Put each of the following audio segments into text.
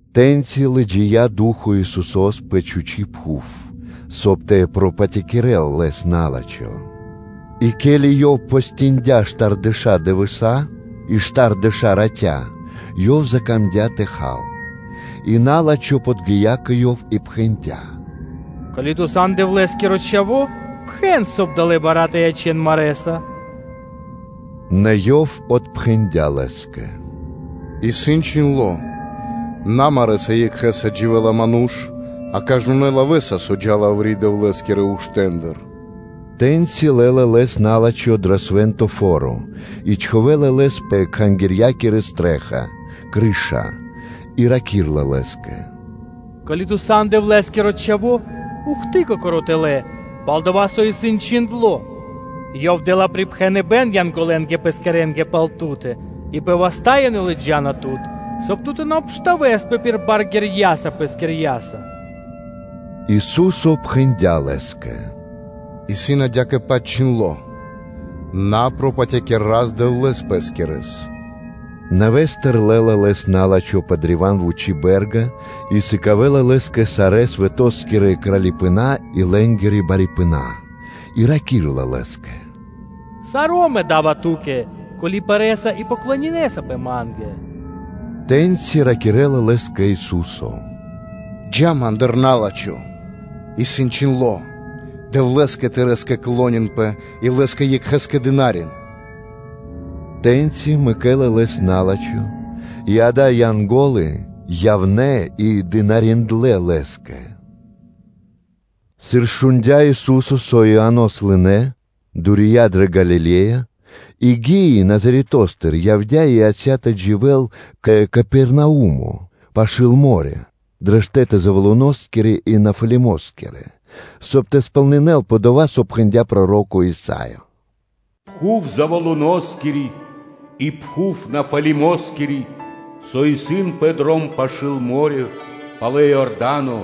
Тэ́ньци лыджия́ Ду́хо (Фа́но) Исусо́с пэ чхучи́ пхув, соб (кай) тэ пропатякирэл Лэс на́лачхо. И ке́ли Ёв постиндя штардэша́ дывэса́ и штардэша́ ратя, Ёв закамдя́ тэ хал. И на́лачхо подги́я кэ Ёв и пхэндя́: “Ко́ли Ту сан Дэвлэ́скиро Чхаво́, пхэн, соб (кай) далэ́ бара́ тэ ячэн марэ́са.” Нэ Ёв отпхэндя́ лэ́скэ: “Исын чхиндло́: ‘На марэ́са екхэ́са дживэ́ла ману́ш, а кажнонэ́ лавэ́са, со джа́ла яври́ Дэвлэ́скирэ уштэндыр’” Тэ́ньци лэ́ла Лэс на́лачхо дро свэ́нто фо́ро и чхувэ́ла Лэс пэ Кхангирья́кири стрэ́ха (чхаки́н), и раки́рла Лэ́скэ: “Ко́ли Ту сан Дэвлэ́скиро Чхаво́, ухты Кокоро́ тэлэ́; пал-дова́ со исын чхиндло́: “Ёв дэ́ла припхэныбэ́н Янголэнгэ (А́нгелэнгэ) Пэскирэнгэ пал Ту́тэ и пэ васта́ ёнэ лыджа́на Тут, соб (кай) Ту тэ на обштавэспэ (тэ на обстэмпинэспэ) пир бар ґэрьяса Пэскирьяса.” Ису́со пхэндя́ лэ́скэ: “Исын адя́кэ-паць (такжэ) чхиндло́: ‘На пропатякир Рас-Дэвлэ́с, Дэвлэ́с пэ́скирэс.’” Нэвэ́стыр лэ́ла Лэс на́лачхо пэ древа́н вучы бэ́рга и сыкавэ́ла Лэ́скэ сарэ́ свэто́скирэ кралипэна́ и лэ́нгирэ барипэна, и раки́рла Лэ́скэ: “Саро́ мэ да́ва Ту́кэ, ко́ли пэрэса и поклонинэсапэ ма́нгэ.” Тэ́ньци ракирэ́ла лэ́скэ Ису́со: “Джа́ Ма́ндыр, на́лачхо, исын чхиндло́: ‘Дэвлэ́скэ тырэ́скэ клонинпэ и Лэ́скэ екхэ́скэ дынарин.’” Тэ́ньци мэкэ́ла Лэс на́лачхо, и акэ, Янго́лы явнэ́ и дынариндлэ́ Лэ́скэ. Сыр шундя́ Ису́со, со Ианос лынэ́, то дурия дрэ Галиле́я; и гии Назаретостыр, явдя́ и яця́ тэ дживэ́л кэ Капернаумо пашы́л мо́рё (дэрья́в), пэ штэ́ты Завулоноскирэ и Нефалимоскирэ, соб (кай) тэ сполнинэ́лпэ дова́, со пхэндя́ проро́ко Исаё: “Пхув Завулоноскири и пхув Нафалимоскири, со исын пэ дром пашы́л мо́рё (дэрья́в), палэ Иорда́но,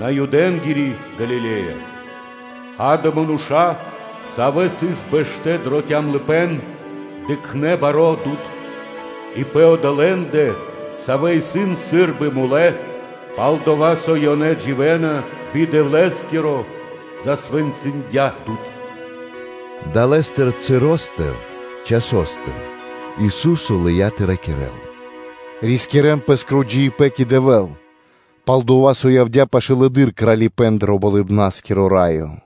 Наюдэнгири Галиле́я, акэ, мануша́, савэ́ сыс бэштэ́ дро калыпэ́н, дыкхнэ́ баро́ дуд (свэ́то); и пэ одолэ́ндэ, савэ́ исын сы́рбы мулэ́, – пал-дова́ со ёнэ дживэ́на би Дэвлэ́скиро, засвэнцындя дуд.” Далэ́ часостыр Ису́со лыя́ тэ ракирэ́л: “Рискирэ́н пэ́скиро джиибэ́н кэ Дэвэ́л, пал-дова́ со явдя́ пашылэды́р Кралипэ́н дро Болыбна́скиро Раё.”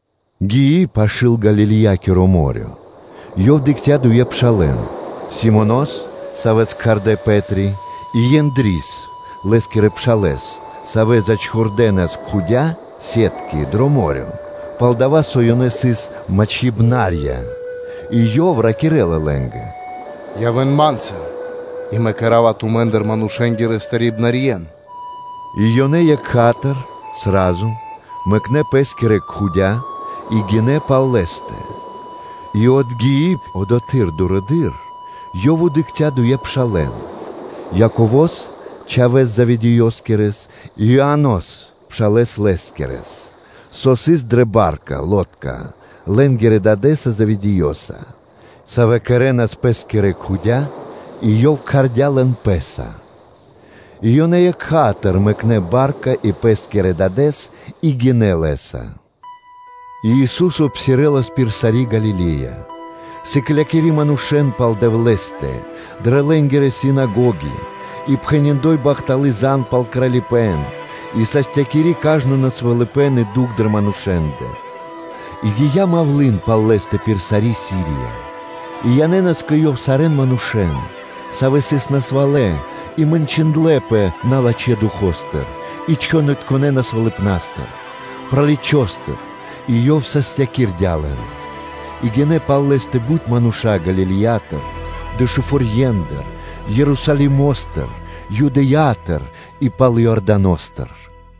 Гии пашы́л Галилеякиро мо́рё (дэрья́в), Ёв дыкхця́ дуе пшалэ́н, Симонос, савэ́с кхардэ́ Пэ́три, и Ендрис (Андреёс), лэ́скирэ пшалэ́с, савэ́ зачхурдэнас кхудя (сетки) дро мо́рё (дэрья́в), пал-дова́ со ёнэ сыс мачхибнарья (рыбаки). И Ёв ракирэ́ла лэ́нгэ: “Явэ́н Ма́нца, и Мэ кэра́ва тумэ́ндыр манушэ́нгирэ мачхибнарьен” И ёнэ екха́тыр (сра́зу) мэкнэ́ пэ́скирэ кхудя́ (се́тки) и гинэ́ пал Лэ́стэ. И отгии одотхы́р дурэды́р, Ёв дыкхця́ дуе пшалэ́н, Яково́с чхавэ́с Заведеёскирэс и Иоанос, пшалэ́с лэскирэс, савэ́ сыс дрэ ба́рка (лодка) лэ́нгирэ дадэ́са Заведеёса, савэ́ кэрэ́нас пэ́скирэ кхудя: и Ёв кхардя́ лэн Пэ́са; и ёнэ екха́тыр мэкнэ́ ба́рка и пэ́скирэ дадэ́с и гинэ́ Лэ́са. И Ису́со псирэлас пир сари́ Галиле́я, сыклякири манушэ́н пал Дэвлэ́стэ дрэ лэ́нгирэ синагоги и пхэни́ бахталы́ зан (звесь) пал Кралипэ́н и састякири кажно насвалыпэн и дукх дрэ манушэ́ндэ. И гия́ мавлы́н (малва) пал Лэ́стэ пир сари́ Сирия: и янэ́нас кэ Ёв сарэ́н манушэ́н, савэ́ сыс насвалэ и мэньчиндлэпэ налачхэ́ Духо́стыр и чхонытконэ насвалыпнастыр, праличостыр, и Ёв састякирдя лэн. И гинэ́ пал Лэ́стэ бут мануша́ Галилеятыр, Дэшуфорьендыр (Десятиградиятыр), Ерусалимо́стыр, Юдэя́тыр и пал Иорданостыр.